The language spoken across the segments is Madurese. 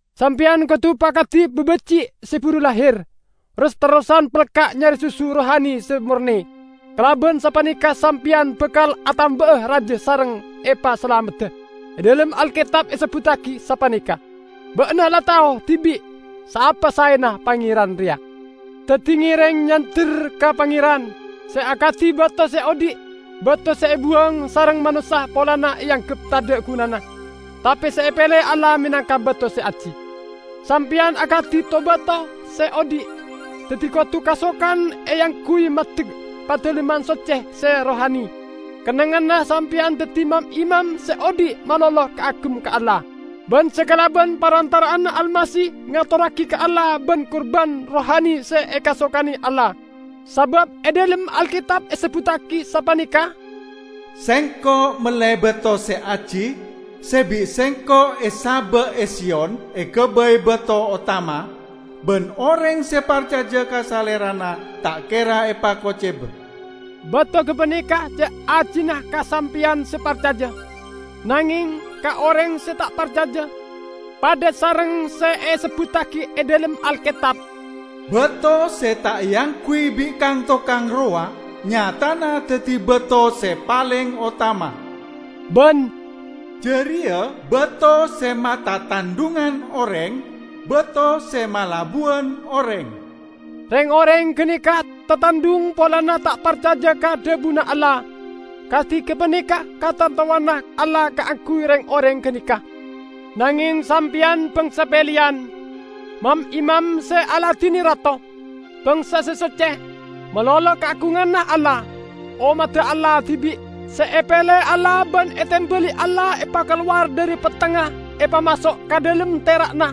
Sampeyan kodu pakadi babaji' se buru lahir, ros-terrosan pelka' nyare susu rohani se morne. Kalaban sapaneka sampeyan bakal atamba'a raja sareng epasalamedda. E dhalem Alketab esebbuttagi sapaneka, "Ba'na la tao dibi' saapa saena Pangeran reya." Daddi ngereng nyander ka Pangeran, se akadi bato se odhi', bato se ebuwang sareng manossa polana eanggep tadha' gunana, tape se epele Allah menangka bato se aji. Sampeyan akadi to-bato se odhi', daddi kodu kasokan eangguy maddek padalemman socce se rohani. Kennengnganna sampeyan daddi mam-imam se odhi' malolo kaagem ka Allah, ban se kalaban parantara'anna Almasih ngatorragi ka Allah ban-kurban rohani se ekasokane Allah. Sabab e dhalem Alketab esebbuttagi sapaneka, "Sengko' mele bato se aji, se bi' Sengko' esaba' e Siyon egabay bato otama, ban oreng se parcaja ka Salerana ta' kera epakoceba." Bato gapaneka ce' ajina ka sampeyan se parcaja. Nangeng, ka oreng se ta' parcaja, padha sareng se esebbuttagi e dhalem Alketab: "Bato se ta' eangguy bi' kang-tokang rowa nyatana daddi bato se paleng otama," ban, "Jareya bato se matatandhungan oreng, bato se malabuwan oreng." Reng-oreng ganeka tatandhung polana ta' parcaja ka dhabuna Allah. Kadi gapaneka katantowanna Allah kaangguy reng-oreng ganeka. Nangeng sampeyan bangsa peleyan, mam-imam se aladine rato, bangsa se socce, malolo kaagunganna Allah, ommadda Allah dibi', se epele Allah ban etembali Allah epakalowar dhari pettengnga epamaso' ka dhalem tera'na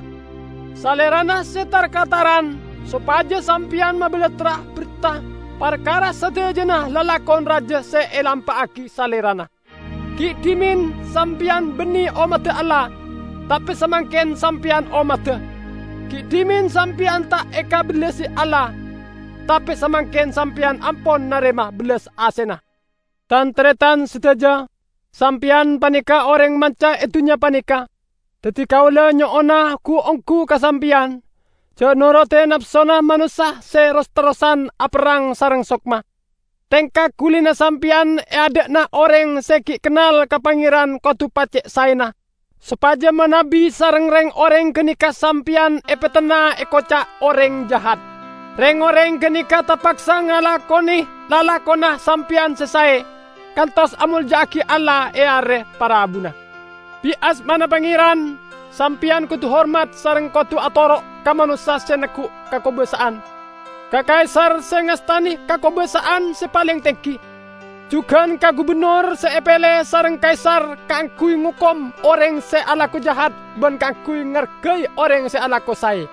Salerana se tar-kataran sopaja sampeyan mabalattra berta parkara sadajana lalakon raja se elampa'agi Salerana. Gi' dhimen sampeyan banne ommadda Allah, tape samangken sampeyan ommadda. Gi' dhimen sampeyan ta' ekabellasi Allah, tape samangken sampeyan ampon narema bellas asena. Tan-taretan sadaja, sampeyan paneka oreng manca e dunnya paneka. Daddi kaula nyo'ona gu-onggu ka sampeyan, ja' norodi napsona manossa se ros-terrosan aperrang sareng sokma. Tengka gulina sampeyan e adha'na oreng se gi' kennal ka Pangeran kodu pace' saena, sopaja manabi sareng reng-oreng ganeka sampeyan epetenna ekoca' oreng jahat, reng-oreng ganeka tapaksa ngakone lalakonna sampeyan se sae, kantos amolja'agi Allah e are parabuna. Bit asmana Pangeran, sampeyan kodu hormat sareng kodu atoro' ka manossa se neggu' kakobasa'an: ka Kaisar se ngastane kakobasa'an se paleng tenggi, jugan ka gubennor se epele sareng Kaisar kaangguy ngokom oreng se alako jahat ban kaangguy ngargai oreng se alako sae.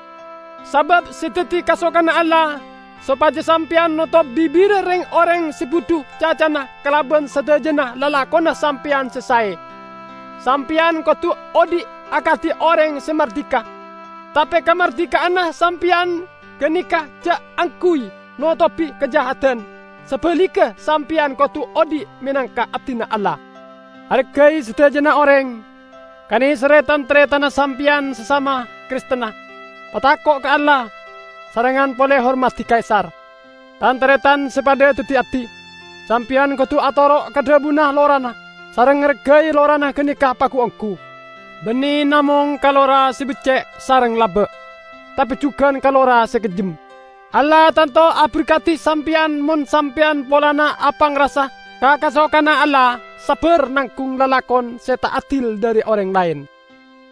Sabab se daddi kasokanna Allah sopaja sampeyan notop bibirra reng-oreng se budhu cacana kalaban sadajana lalakonna sampeyan se sae. Sampeyan kodu odhi' akadi oreng se mardika, tape kamardika'anna sampeyan ganeka ja' angguy notobi kajahadan; sabaligga sampeyan kodu odhi' menangka abdina Allah. Argai sadajana oreng, kaneserre tan-taretanna sampeyan sasama Kristenna. Patako' ka Allah, sarengngan pole hormadi Kaisar. Tan-taretan se padha daddi abdi, sampeyan kodu atoro' ka dhabuna lorana, sareng ngargai lorana ganeka pagu-onggu. Banne namong ka lora se becce' sareng laba, tape jugan ka lora se kejjem. Allah tanto aberkadi sampeyan mon sampeyan polana apangrasa ka kasokanna Allah sabbar nanggung lalakon se ta' adil dhari oreng laen.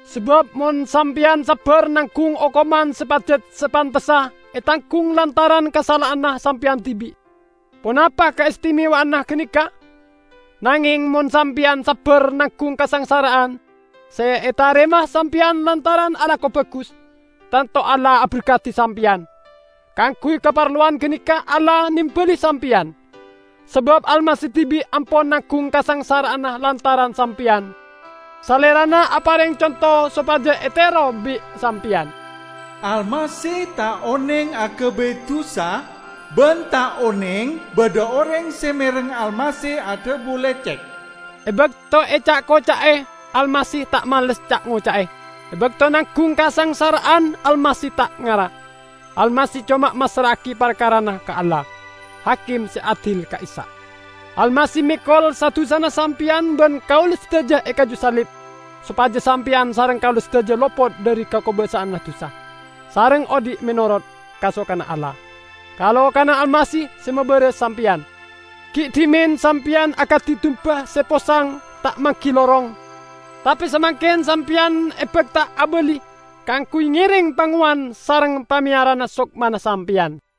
Sabab mon sampeyan sabbar nanggung okoman se pajat sapantessa etanggung lantaran kasala'anna sampeyan dibi', ponapa kaistimewa'anna ganeka? Nangeng mon sampeyan sabbar nanggung kasangsara'an se etarema sampeyan lantaran alako bagus, tanto Allah aberkadi sampeyan. Kaangguy kaparlowan ganeka Allah nembali sampeyan. Sabab Almasih dibi' ampon nanggung kasangsara'an lantaran sampeyan; Salerana apareng conto sopaja etero bi' sampeyan. Almasih ta' oneng agabay dusa, ban ta' oneng badha oreng se mereng Almasih adhabu lecek. E bakto eca'-koca'e Almasih ta' males ca'-ngoca'e. E bakto nanggung kasangsara'an Almasih ta' ngara; Almasih coma massra'agi parkarana ka Allah, Hakim se adil ka'issa'. Almasih mekol sa-dusana sampeyan ban kaula sadaja e kaju salib, sopaja sampeyan sareng kaula sadaja lopot dhari kakobasa'anna dusa, sareng odhi' menorot kasokanna Allah. Ka-lokana Almasih se mabaras sampeyan. Gi' dhimen sampeyan akadi dumba se posang ta' manggi lorong, tape samangken sampeyan ebakta abali kaangguy ngereng Pangowan sareng Pameyarana sokmana sampeyan.